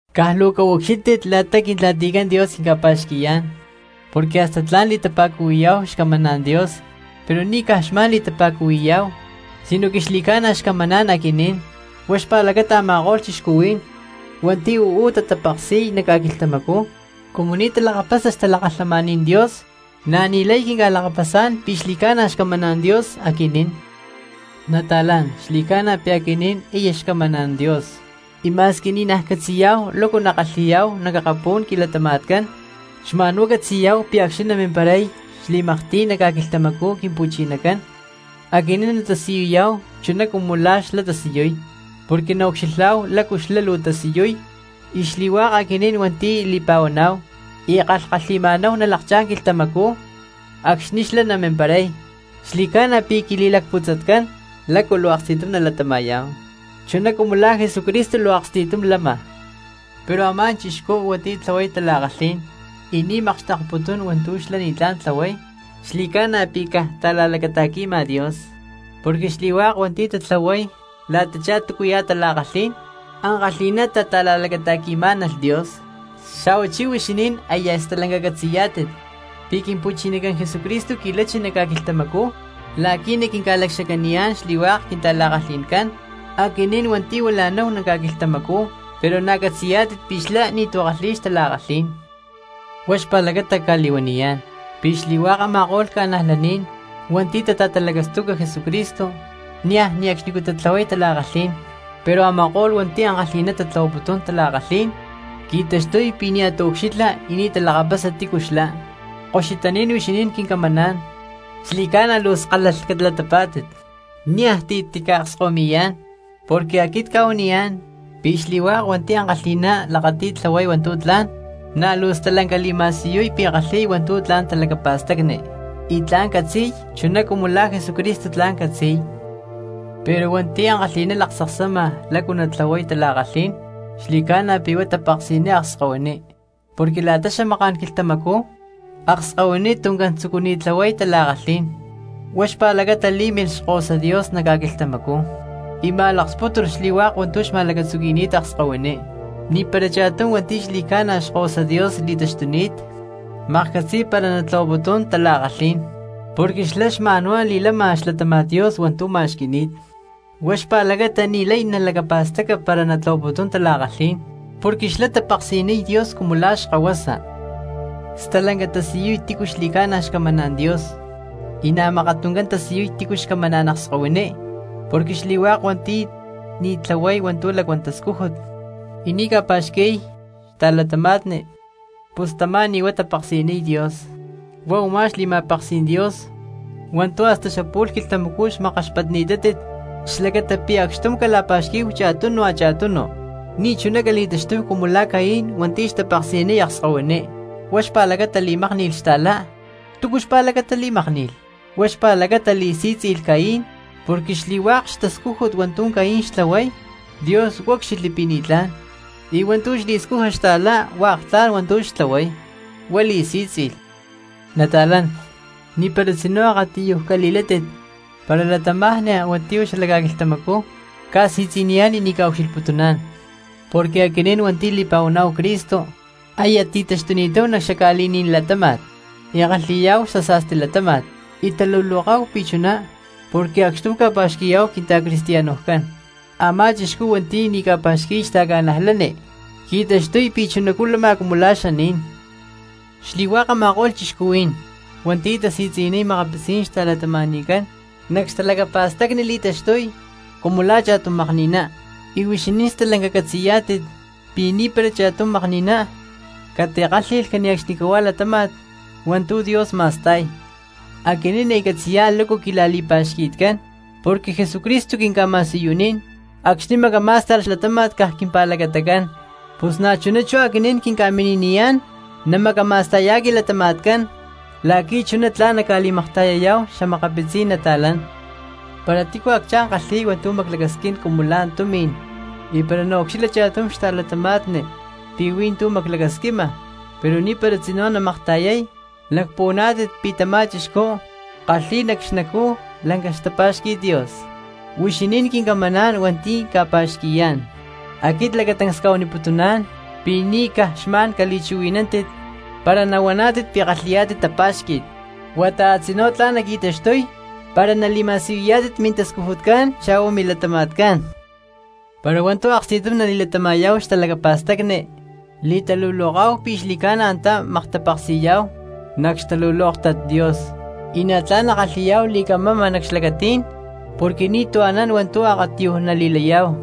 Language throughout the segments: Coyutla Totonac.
Caj luu caucxílhtit la̠ta Quintla̠ticán Dios quinca̠pa̠xqui̠yá̠n, porque hasta tla̠n li̠tapa̠cuhui̠yá̠hu xcamaná̠n Dios, pero ni̠ caj xma̠n li̠tapa̠cuhui̠yá̠hu sinoque xli̠ca̠na xcamaná̠n aquinín. Huá xpa̠lacata a̠ma̠ko̠lh cristianos hua̠nti̠ uú tatapeksi̠y nac ca̠quilhtamacú, cumu ni̠ talakapasa xtalakalhamaní̠n Dios, na̠ ni̠lay quinca̠lakapasá̠n pi̠ xli̠ca̠na xcamaná̠n Dios aquinín. Nata̠lán, xli̠ca̠na pi̠ aquinín aya xcamaná̠n Dios, y ma̠squi ni̠naj catzi̠yá̠hu lácu nakalhi̠ya̠chá̠hu nac akapú̠n quilatama̠tcán, xma̠nhuá catzi̠yá̠hu pi̠ acxni̠ namimparay xli̠maktiy nac ca̠quilhtamacú Quimpu̠chinacán aquinín natasiyuyá̠hu chuná cumu la̠ xlá tasiyuy porque naucxilhá̠hu lácu xlá luu tasiyuy. Y xli̠hua̠k aquinín hua̠nti̠ li̠pa̠huaná̠hu y kalhkalhi̠ma̠náhu nalakchá̠n quilhtamacú acxni̠ xlá namimparay, xli̠ca̠na pi̠ quili̠lacputzatcán lácu luu aksti̠tum nalatama̠yá̠hu chuná cumu la̠ Jesucristo luu aksti̠tum lama. Pero a̠má cristiano hua̠nti̠ tlahuay tala̠kalhí̠n y ni̠ makxtekputún hua̠ntu̠ xlá ni̠tlá̠n tlahuay, xli̠ca̠na pi̠ caj ta̠la̠lacata̠qui̠ma Dios, porque xli̠hua̠k hua̠nti̠ tatlahuay la̠tachá túcuya̠ tala̠kalhí̠n ankalhi̠ná tata̠la̠lacata̠qui̠má̠nalh Dios. Xa̠huachí huixinín aya stalanca catzi̠yá̠tit pi̠ Quimpu̠chinacán Jesucristo qui̠lachi nac ca̠quilhtamacú la̠qui̠ naquinca̠lacxacaniyá̠n xli̠hua̠k quintala̠kalhi̠ncán xli̠hua̠k aquinín hua̠nti̠ huila̠náhu nac ca̠quilhtamacú, pero na̠ catzi̠yá̠tit pi̠ xlá ni̠tu̠ kalhi̠y xtala̠kalhí̠n. Huá xpa̠lacata cca̠li̠huaniyá̠n pi̠ xli̠hua̠k a̠ma̠ko̠lh cristianos hua̠nti̠ tata̠talacastuca Jesucristo niaj ne̠cxnicú tatlahuay tala̠kalhi̠n, pero a̠ma̠ko̠lh hua̠nti̠ ankalhi̠ná tatlahuaputún tala̠kalhí̠n qui̠taxtuy pi̠ nia̠ taucxilha y nia̠ talakapasa tícu xlá. Koxutaní̠n huixinín quincamaná̠n, xli̠ca̠na luu skálalh calatapá̠tit, niaj ti̠ tica̠akskahuimi̠yá̠n, porque aquit cca̠huaniyá̠n pi̠ xli̠hua̠k hua̠nti̠ ankalhi̠ná lakati̠y tlahuay hua̠ntu̠ tla̠n, na̠ luu stalanca li̠ma̠siyuy pi̠ kalhi̠y hua̠ntu̠ tla̠n talacapa̠stacni y tla̠n catzi̠y chuná cumu la̠ Jesucristo tla̠n catzi̠y. Pero hua̠nti̠ ankalhi̠ná laktzaksama lácu natlahuay tala̠kalhí̠n xli̠ca̠na pi̠ huá tapeksi̠niy akskahuiní, porque la̠ta xamaká̠n quilhtamacú akskahuiní tuncán tzucuni̠t tlahuay tala̠kalhí̠n. Huá xpa̠lacata lí̠milh Xkahuasa Dios nac ca̠quilhtamacú y ma̠lakspútulh xli̠hua̠k hua̠ntu̠ xma̠lacatzuqui̠ni̠t akskahuiní. Ni̠para cha̠tum hua̠nti̠ xli̠ca̠na xkahuasa Dios li̠taxtuni̠t maklhcatzi̠y para natlahuaputún tala̠kalhí̠n, porque xlá xma̠nhuá li̠lama xlatáma̠t Dios hua̠ntu̠ ma̠xqui̠ni̠t, huá xpa̠lacata ni̠lay nalacapa̠staca para natlahuaputún tala̠kalhí̠n porque xlá tapeksi̠niy Dios cumu la̠ xkahuasa. Stalanca tatasiyuy tícu xli̠ca̠na xcamaná̠n Dios, y na̠ mákat tuncán tatasiyuy xatícu xcamaná̠n akskahuiní, porque xli̠hua̠k hua̠nti̠ ni̠ tlahuay hua̠ntu̠ lacuán tascújut y ni̠ ca̠pa̠xqui̠y xta̠cristianos pus tamá ni̠ huá tapeksi̠niy Dios. Huá u̠má xli̠ma̠peksí̠n Dios hua̠ntu̠ hasta xapu̠lhá quilhtamacú xmakkaxpatni̠tátit xlacata pi̠ lacxtum cala̠pa̠xquí̠hu cha̠tunu cha̠tunu. Ni̠chuná cali̠taxtúhu cumu la̠ Caín hua̠nti̠ xtapeksi̠niy akskahuiní, huá xpa̠lacata li̠mákni̠lh xta̠lá. ¿Túcu xpa̠lacata li̠mákni̠lh? Huá xpa̠lacata li̠sí̠tzi̠lh Caín porque xli̠hua̠k xtascújut hua̠ntu̠ Caín xtlahuay Dios úcxilhli pi̠ ni̠tlá̠n, y hua̠ntu̠ xli̠scuja xta̠lá hua̠k tla̠n hua̠ntu̠ xtlahuay, huá li̠sí̠tzi̠lh. Nata̠lán, ni̠para tzinú akatiyuj cali̠látit para cristianos hua̠nti̠ uú xala ca̠quilhtamacú ca̠si̠tzi̠niyá̠n y ni̠ ca̠ucxilhputuná̠n. Porque aquinín hua̠nti̠ li̠pa̠huaná̠hu Cristo aya ti̠taxtuni̠táhu nac xaca̠li̠ní̠n latáma̠t y kalhi̠yá̠hu xasa̠sti latáma̠t, y taluloká̠hu pi̠ chuná porque acxtum ca̠pa̠xqui̠yá̠hu quinta̠cristianoscán. Amá cristianos hua̠nti̠ ni̠ ca̠pa̠xqui̠y xta̠cristianos qui̠taxtuy pi̠ chunacú lama cumu la̠ xaní̠n. Xli̠hua̠k a̠ma̠ko̠lh cristianos hua̠nti̠ tasi̠tzi̠niy xa̠makapitzí̠n xta̠cristianoscán, nac xtalacapa̠stacni li̠taxtuy cumu la̠ cha̠tum makni̠ná, y huixinín stalanca catzi̠yá̠tit pi̠ ni̠para cha̠tum makni̠ná catikálhi̠lh cane̠cxnicahuá latáma̠t hua̠ntu̠ Dios ma̠sta̠y. Aquinín aya lakapasá̠hu lácu quila̠li̠pa̠xqui̠tcán porque Jesucristo quinca̠ma̠siyunín acxni̠ macamá̠sta̠lh xlatáma̠t caj quimpa̠lacatacán, pus na̠chuná chú aquinín quinca̠mini̠niyá̠n namacama̠sta̠yá̠hu quilatama̠tcán la̠qui̠ chuná tla̠n naca̠li̠makta̠yayá̠hu xa̠makapitzí̠n cristianos. Para tícu acchá̠n kalhi̠y hua̠ntu̠ maclacasquín cumu la̠ tumi̠n, y para naucxilha cha̠tum xta̠cristiano pi̠ hui̠ntú maclacasquima pero ni̠para tzinú namakta̠yay, ¿lacpuhuaná̠tit pi̠ tamá cristiano kalhi̠y nac xnacú lanca xtapá̠xqui̠t Dios? Huixinín quincamaná̠n hua̠nti̠ cca̠pa̠xqui̠yá̠n, aquit lacatancs cca̠huaniputuná̠n pi̠ ni̠ caj xma̠n cali̠chuhui̠nántit para nahuaná̠tit pi̠ kalhi̠yá̠tit tapa̠xqui̠t, huata a̠tzinú tla̠n naqui̠taxtuy para nali̠ma̠siyuyá̠tit mintascujutcán xa̠hua milatama̠tcán. Para hua̠ntu̠ aksti̠tum nali̠latama̠yá̠hu xtalacapa̠stacni li̠taluloká̠hu pi̠ xli̠ca̠na antá maktapeksi̠yá̠hu nac xtalulóktat Dios y na̠ tla̠n nakalhi̠yá̠hu li̠camama nac xlacatí̠n porque ni̠tu̠ anán hua̠ntu̠ akatiyuj nali̠layá̠hu.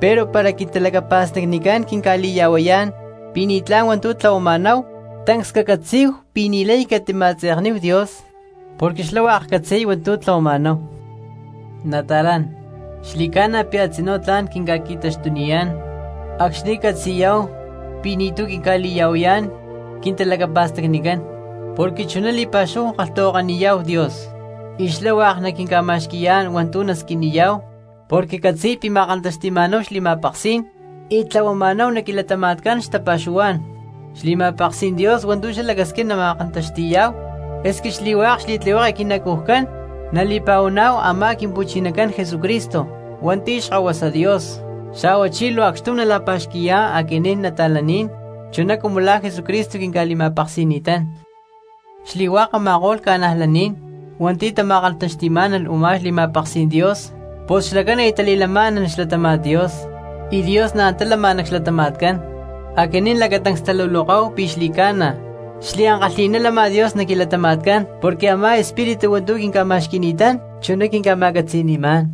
Pero para quintalacapa̠stacnicán quinca̠li̠ya̠huayá̠n pi̠ ni̠tlá̠n hua̠ntu̠ tlahuama̠náhu, tancs cacatzí̠hu pi̠ ni̠lay catima̠tzekniyá̠hu Dios porque xlá hua̠k catzi̠y hua̠ntu̠ tlahuama̠náhu. Nata̠lán, xli̠ca̠na pi̠ a̠tzinú tla̠n quinca̠qui̠taxtuniyá̠n acxni̠ catzi̠yá̠hu pi̠ ni̠tu̠ quinca̠li̠ya̠huayá̠n quintalacapa̠stacnicán porque chuná li̠pa̠xúhu kalhtahuakaniyá̠hu Dios, y xlá hua̠k naquinca̠ma̠xqui̠yá̠n hua̠ntu̠ nasquiniyá̠hu porque catzi̠y pi̠ ma̠kantaxti̠ma̠náhu xli̠ma̠peksí̠n y tlahuama̠náhu nac quilatama̠tcán xtapa̠xuhuá̠n. Xli̠ma̠peksí̠n Dios hua̠ntu̠ xlá lacasquín nama̠kantaxti̠yá̠hu, esque xli̠hua̠k xli̠tlihueke quinacujcán nali̠pa̠huaná̠hu a̠má Quimpu̠chinacán Jesucristo hua̠nti̠ Xkahuasa Dios, xa̠huachí luu acxtum nala̠pa̠xqui̠yá̠hu aquinín cristianos chuná cumu la̠ Jesucristo quinca̠li̠ma̠peksi̠ni̠tán. Xli̠hua̠k a̠ma̠ko̠lh cristianos hua̠nti̠ tama̠kantaxti̠má̠nalh u̠má xli̠ma̠peksí̠n Dios pus xlacán aya tali̠lamá̠nalh xlatáma̠t Dios, y Dios na̠ antá lama nac xlatama̠tcán. Aquinín lacatancs taluloká̠hu pi̠ xli̠ca̠na xliankalhi̠ná lama Dios nac quilatama̠tcán porque a̠má xEspíritu hua̠ntu̠ quinca̠ma̠xqui̠ni̠tán chuná quinca̠ma̠catzi̠ni̠má̠n.